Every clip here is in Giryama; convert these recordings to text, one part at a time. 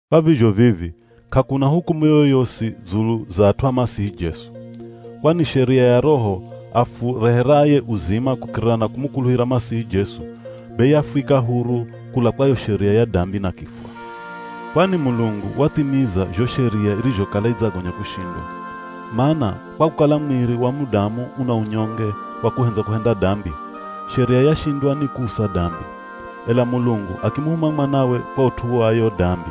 Kwa vizho vivi, k'akuna hukumu yoyosi dzulu za at'u a Masihi Jesu. Kwani sheria ya Roho afureheraye uzima kukirira na kumukuluhira Masihi Jesu, be yafwika huru kula kwa yo sheria ya dambi na kifwa. Kwani Mulungu wathimiza zho Sheria irizhokala idzagonya kushindwa. Mana kwa kukala mwiri wa mudamu una unyonge wa kuhendza kuhenda dambi, Sheria yashindwa ni kuusa dambi. Ela Mulungu akimuhuma mwanawe kwa ut'u wa yo dambi.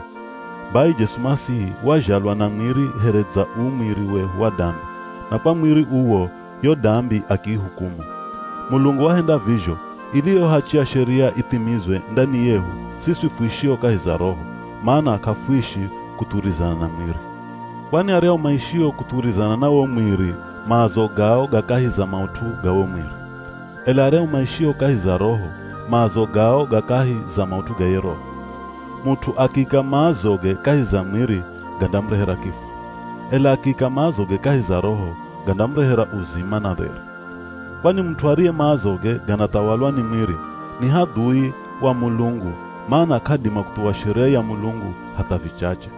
Bai, Jesu Masihi wazhalwa na mwiri here dza uu mwiri wehu wa dambi, na kwa mwiri uwo yo dambi akiihukumu. Mulungu wahenda vizho ili yo hachi ya Sheria ithimizwe ndani yehu siswi fuishio kahi za Roho, mana k'afuishi kuthuwirizana na mwiri. Kwani aryahu maishio kuthuwirizana na wo mwiri maazo gao ga kahi za maut'u ga wo mwiri. Ela aryahu maishio kahi za Roho maazo gao ga kahi za maut'u ga ye Roho. Mut'u akiika maazoge kahi za mwiri gandamurehera kifwa. Ela akiika maazoge kahi za Roho gandamurehera uzima na dheri. Kwani mut'u ariye maazoge ganathawalwa ni mwiri, ni hadhui wa Mulungu mana k'adima kuthuwa Sheria ya Mulungu hatha vichache.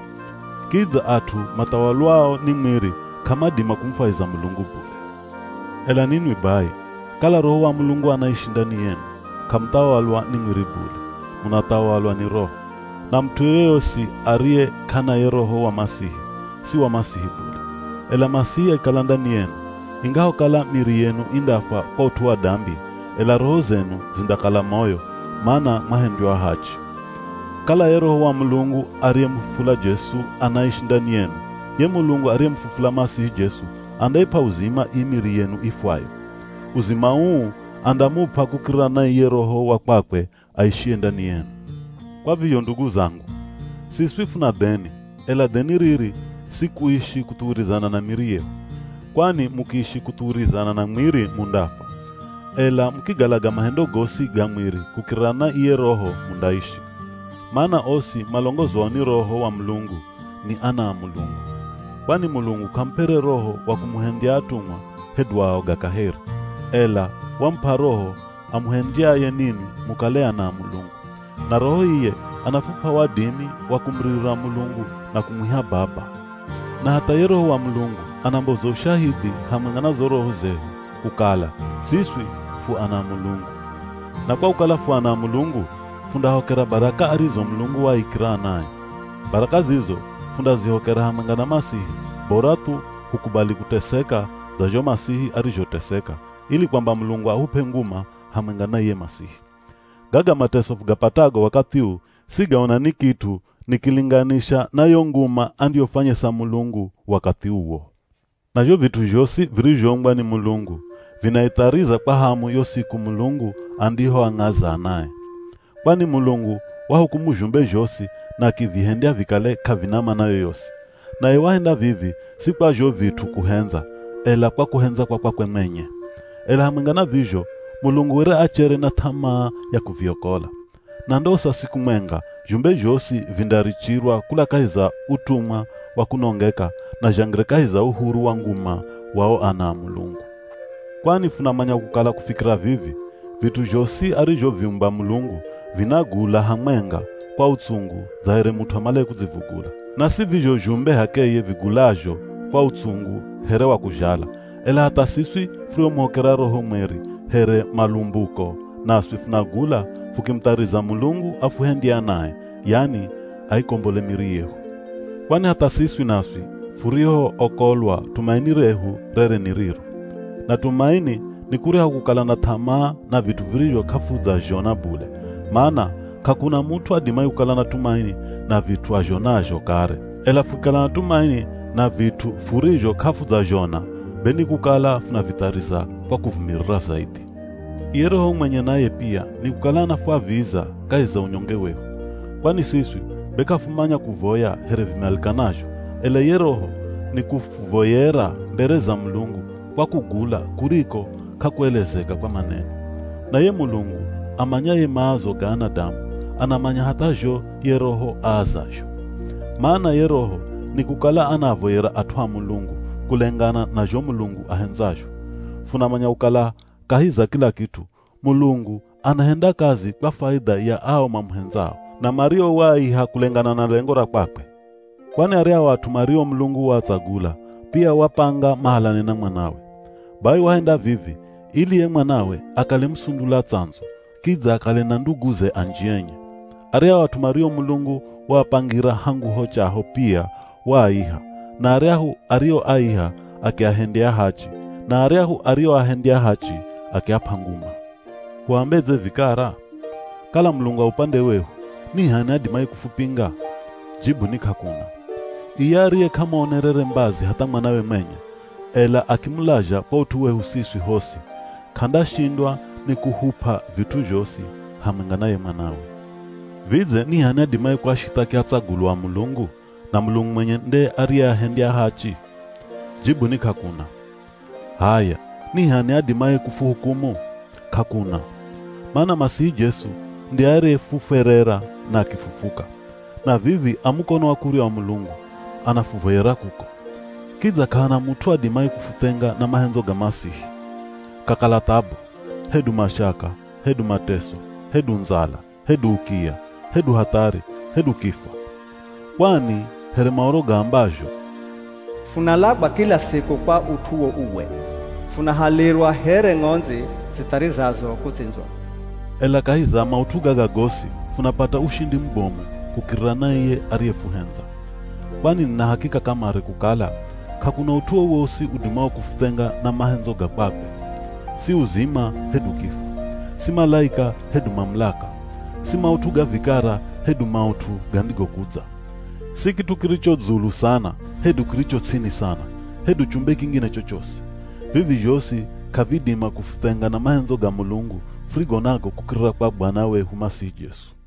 Kidza at'u mathawalwao ni mwiri k'amadima kumufwahiza Mulungu bule. Ela ninwi bai, kala Roho wa Mulungu anaishi ndani yenu, k'amuthawalwa ni mwiri bule, munathawalwa ni Roho. Na mut'u yoyosi ariye k'ana ye Roho wa Masihi, si wa Masihi bule. Ela Masihi akikala ndani yenu, ingahokala miri yenu indafwa kwa ut'u wa dambi, ela roho zenu zindakala moyo, mana mwahendywa ahachi. Kala ye Roho wa Mulungu ariyemufufula Jesu anaishi ndani yenu, ye Mulungu ariyemufufula Masihi Jesu andaip'a uzima ii miri yenu ifwayo. Uzima uu andamup'a kukirira na iye Roho wa kwakwe aishiye ndani yenu. Kwa vizho ndugu zangu, siswi funa dheni, ela dheni riri si kuishi kuthuwirizana na miri yehu. Kwani mukiishi kuthuwirizana na mwiri mundafwa. Ela mukigalaga mahendo gosi ga mwiri kukirira na iye Roho, mundaishi. Mana osi malongozwao ni Roho wa Mulungu ni ana a Mulungu. Kwani Mulungu k'amup'ere roho wa kumuhendya atumwa hedu aoga kaheri, ela wamup'a Roho amuhendyaye ninwi mukale ana a Mulungu. Na Roho iye anafup'a wadimi wa kumuririra Mulungu na kumwiha “Baba!” Na hatha ye Roho wa Mulungu anamboza ushahidhi hamwenga na zo roho zehu kukala siswi fu ana a Mulungu. Na kwa kukala fu ana a Mulungu, fundahokera baraka arizo Mulungu waaikira anae. Baraka zizo fundazihokera hamwenga na Masihi, bora thu hukubali kuteseka dza zho Masihi arizhoteseka ili kwamba Mulungu ahup'e nguma hamwenga na iye Masihi. Gaga mateso fugapatago wakathi uu, sigaona ni kit'u nikilinganisha na yo nguma andiyofwanyesa Mulungu wakathi uwo. Na zho vit'u zhosi virizhoumbwa ni Mulungu vinaithariza kwa hamu yo siku Mulungu andihoang'aza anae. Kwani Mulungu wahukumu zhumbe zhosi na akivihendya vikale k'avina mana yoyosi. Naye wahenda vivi si kwa zho vit'u kuhendza, ela kwa kuhendza kwa kwakwe mwenye. Ela hamwenga na vizho Mulungu were achere na th'amaa ya kuviokola. Na ndosa siku mwenga zhumbe zhosi vindarichirwa kula kahi za utumwa wa kunongeka na zhangire kahi za uhuru wa nguma wa o ana a Mulungu. Kwani funamanya kukala kufikira vivi, vit'u zhosi arizhoviumba Mulungu vinagula hamwenga kwa utsungu dza here mut'u amalaye kudzivugula. Na si vizho zhumbe h'akeye vigulazho kwa utsungu here wa kuzhala, ela hatha siswi furiomuhokera Roho Mweri here malumbuko naswi funagula fukimuthariza Mulungu afuhendye anae, yani aikombole miri yehu. Kwani hatha siswi naswi furihookolwa tumaini rehu rere ni riro. Na tumaini ni kuryahu kukala na th'amaa na vit'u virizho k'afudzazhona bule, mana k'akuna mut'u adimaye kukala na tumaini na vit'u azhonazho kare. Ela fukikala na tumaini na vit'u furizho k'afudzazhona, be ni kukala funavithariza kwa kuvumirira zaidhi. Iye Roho mwenye naye pia nikukala anafwaviza kahi za unyonge wehu. Kwani siswi be k'afumanya kuvoya here vimalikanazho, ela iye Roho nikufuvoyera mbere za Mulungu kwa kugula kuriko k'akuelezeka kwa maneno. Na ye Mulungu amanyaye maazo ga anadamu, anamanya hatha zho ye Roho aazazho. Mana ye Roho nikukala anaavoyera at'u a Mulungu, kulengana na zho Mulungu ahendzazho. Funamanya kukala kahi za kila kit'u, Mulungu anahenda kazi kwa faidha ya ao mamuhendzao, na mario waaiha kulengana na lengo ra kwakwe. Kwani aryahu at'u mario Mulungu waatsagula, pia wapanga mahalane na Mwanawe. Bai wahenda vivi ili ye Mwanawe akale musundula tsandzu, kidza akale na nduguze anji enye. Aryahu at'u mario Mulungu waapangira hangu ho chaho pia waaiha; na aryahu arioaiha, akiahendya ahachi; na aryahu arioahendya ahachi, akiap'a nguma. Huambedze vikara? Kala Mulungu a upande wehu, ni h'ani adimaye kufupinga? Jibu ni k'akuna. Iye ariye k'amuonerere mbazi hatha Mwanawe mwenye, ela akimulazha kwa ut'u wehu siswi hosi, k'andashindwa ni kuhup'a vit'u zhosi hamwenga na ye Mwanawe. Vidze ni h'ani adimaye kuashithaki atsagulwa a Mulungu, na Mulungu mwenye nde ariyeahendya ahachi? Jibu ni k'akuna! H'aya, ni h'ani adimaye kufuhukumu? K'akuna! Mana Masihi Jesu nde ariyehufwerera na akifufuka. Na vivi a mukono wa kurya wa Mulungu, anafuvoyera kuko. Kidza k'ahana mut'u adimaye kufuthenga na mahendzo ga Masihi. Kakala thabu, hedu mashaka, hedu mateso, hedu ndzala, hedu ukiya, hedu hathari, hedu kifwa. Kwani here Maoro gaambazho, “Funalagwa kila siku kwa ut'uwo uwe, funahalirwa here ng'ondzi zitharizazo kutsindzwa.” Ela kahi za maut'u gaga gosi, funapata ushindi mubomu kukirira na iye ariyefuhendza. Kwani nina hakika kamare kukala, k'akuna ut'u wowosi udimao kufuthenga na mahendzo ga kwakwe. Si uzima hedu kifwa, si malaika hedu mamulaka, si maut'u ga vikara hedu maut'u gandigokudza. Si kit'u kiricho dzulu sana, hedu kiricho ts'ini sana, hedu chumbe kingine chochosi. Vivi zhosi k'avidima kufuthenga na mahendzo ga Mulungu furigo nago kukirira kwa Bwana wehu Masihi Jesu.